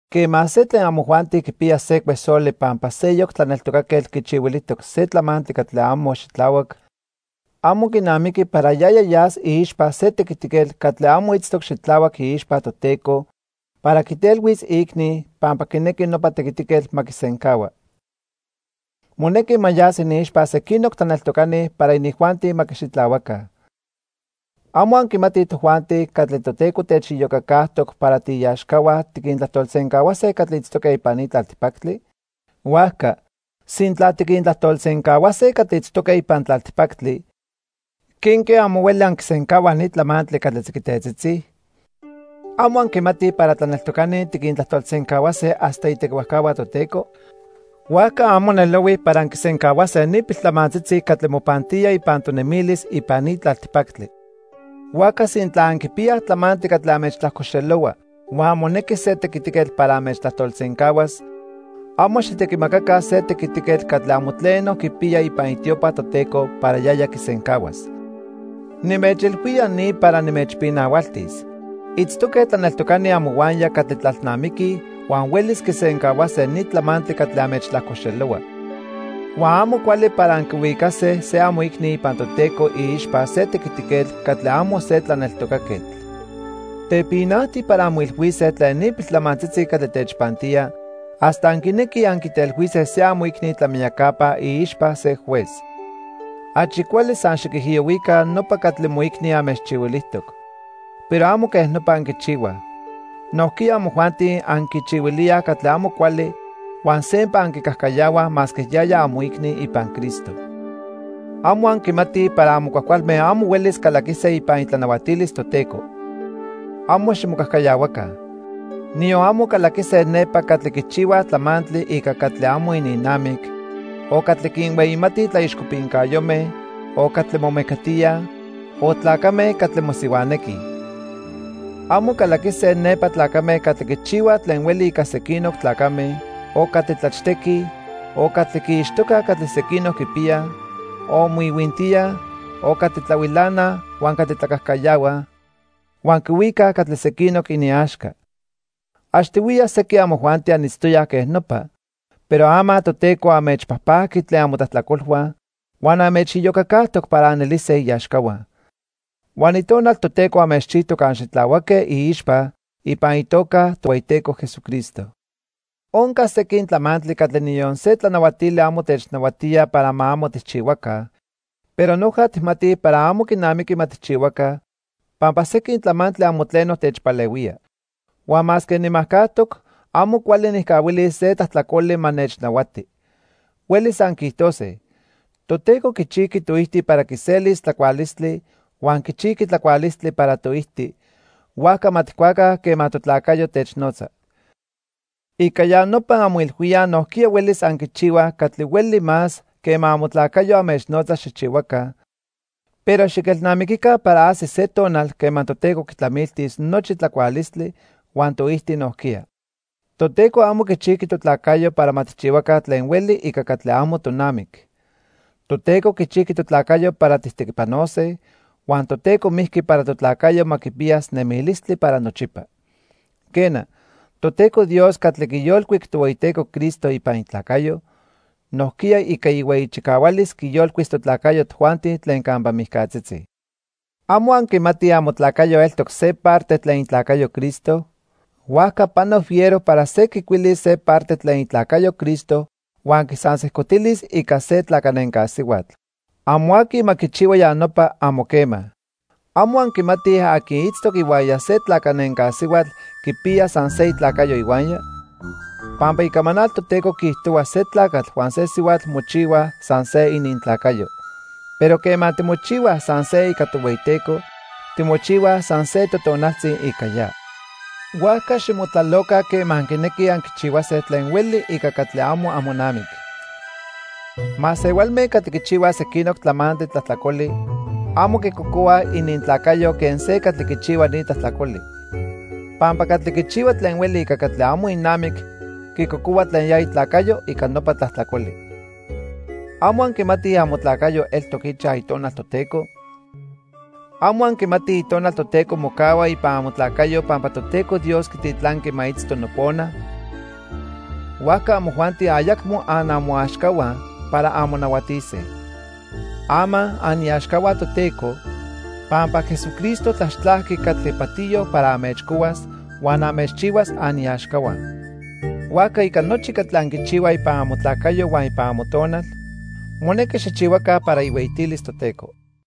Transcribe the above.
Quema se tlen amojuanti quipiya se cuesoli pampa seyoc tlaneltocaquetl quichihuilijtoc se tlamantli catli amo xitlahuac, amo quinamiqui para yaya yas iixpa se tequitiquetl catli amo itztoc xitlahuac iixpa Toteco para quitelhuis iicni pampa quinequi nopa tequitiquetl ma quisencahua. Monequi ma yas iniixpa sequinoc tlaneltocani para inijuanti ma quixitlahuaca. ¿Amo anquimatij tojuanti catli Toteco techiyocacajtoc para tiiaxcahua tiquintlajtolsencahuase catli itztoque ipan ni tlaltipactli? Huajca, sintla tiquintlajtolsencahuase catli itztoque ipan tlaltipactli, ¿quenque amo hueli anquisencahuaj ni tlamantli catli tziquitetzitzi? ¿Amo anquimatij para titlaneltocani tiquintlajtolsencahuase hasta itequihuajcahua Toteco? Huajca amo nelohui para anquisencahuase ni piltlamantzitzi catli mopantía ipan tonemilis ipan ni tlaltipactli. Huajca sintla anquipiyaj tlamantli catli anmechtlajcoxelohua huan monequi se tequitiquetl para anmechtlajtolsencahuas, amo xijtequimacaca se tequitiquetl catli amo tleno quipiya ipan itiopa Toteco para yaya quisencahuas. Nimechilhuía ni para nimechpinahualtis. Itztoque tlaneltocani amohuaya catli tlalnamiquij huan huelis quisencahuase ni tlamantli catli anmechtlajcoxelohua. Huan amo cuali para anquihuicase se amoicni ipan Toteco iixpa se tequitiquetl catli amo se tlaneltocaquetl. Tepinajti para anmoilhuise tlen ni piltlamantzitzi catli techpantía hasta anquinequij anquitelhuise se amoicni tlamiyacapa iixpa se juez. Achi cuali san xiquijiyohuica nopa catli moicni anmechchihuilijtoc. Pero amo quej nopa anquichihuaj. Nojquiya amojuanti anquichihuilíaj catli amo cuali huan sempa anquicajcayahuaj masque yaya amoicni ipan Cristo. Amo anquimatij para amo cuajcualme amo huelis calaquise ipan itlanahuatilis Toteco. ¡Amo ximocajcayahuaca! Niyon amo calaquise nepa catli quichihuaj tlamantli ica catli amo ininnamic, o catli quinhueyimatij tlaixcopincayome, o catli momecatíaj, o tlacame catli mosihuanequij. Amo calaquise nepa tlacame catli quichihuaj tlen hueli ica sequinoc tlacame, o catli tlachtequij, o catli quiixtocaj catli sequinoc quipiyaj, o moihuintíaj, o catli tlahuilanaj huan catli tlacajcayahuaj huan quihuicaj catli sequinoc iniaxca. Achtihuiya sequin amojuanti anitztoyaj quej nopa, pero ama Toteco anmechpajpajqui tlen amotlajtlacolhua huan anmechiyocacajtoc para anelise iaxcahua. Huan Itonal Toteco anmechchijtoc anxitlahuaque iixpa ipan itoca Tohueyiteco Jesucristo. Onca sequin tlamantli catli niyon se tlanahuatili amo technahuatía para ma amo tijchihuaca, pero noja tijmatij para amo quinamiqui ma tijchihuaca, pampa sequin tlamantli amo tleno techpalehuía. Huan masque nimajcajtoc, amo cuali nijcahuilis se tlajtlacoli ma nechnahuati. Huelis anquiijtose: "Toteco quichijqui toijti para quiselis tlacualistli huan quichijqui tlacualistli para toijti, huajca ma tijcuaca quema totlacayo technotza." Ica ya nopa anmoilhuíaj nojquiya huelis anquichihuaj catli hueli más quema amotlacayo anmechnotza xijchihuaca, pero xiquelnamiquica para ajsis se tonal quema Toteco quitlamiltis nochi tlacualistli huan toijti nojquiya. Toteco amo quichijqui totlacayo para ma tijchihuaca tlen hueli ica catli amo tonamic. Toteco quichijqui totlacayo para tijtequipanose, huan Toteco mijqui para totlacayo ma quipiyas nemilistli para nochipa. Quena, Toteco Dios catli quiyolcuic Tohueyiteco Cristo ipan itlacayo, nojquiya ica ihueyi chicahualis quiyolcuis totlacayo tojuanti tlen campa mijcatzitzi. ¿Amo anquimatij amotlacayo eltoc se parte tlen itlacayo Cristo? Huajca pano fiero para se quicuilis se parte tlen itlacayo Cristo huan quisansejcotilis ica se tlacanenca sihuatl. Amo aqui ma quichihua ya nopa, amo quema. ¿Amo anquimatij aqui itztoc ihuaya se tlacanenca sihuatl quipiya san se itlacayo ihuaya? Pampa Icamanal Toteco quiijtohua se tlacatl huan se sihuatl mochihuaj san se inintlacayo. Pero quema timochihuaj san se ica Tohueyiteco, timochihuaj san se totonaltzi ica ya. Huajca ximotlaloca quema anquinequij anquichihuase tlen hueli ica catli amo amonamic. Masehualme catli quichihuaj sequinoc tlamantli tlajtlacoli amo quicocohuaj inintlacayo quen se catli quichihua ni tlajtlacoli. Pampa catli quichihua tlen hueli ica catli amo inamic quicocohua tlen ya itlacayo ica nopa tlajtlacoli. ¿Amo anquimatij amotlacayo eltoc ichaj Itonal Toteco? ¿Amo anquimatij Itonal Toteco mocahua ipan amotlacayo pampa Toteco Dios quititlanqui ma itzto nopona? Huajca amojuanti ayacmo anamoaxcahua para anmonahuatise. Ama aniaxcahua Toteco, pampa Jesucristo tlaxtlajqui catli patiyo para anmechcohuas huan anmechchihuas aniaxcahua. Huajca ica nochi catli anquichihuaj ipan amotlacayo huan ipan amotonal, monequi xijchihuaca para ihueyitilis Toteco.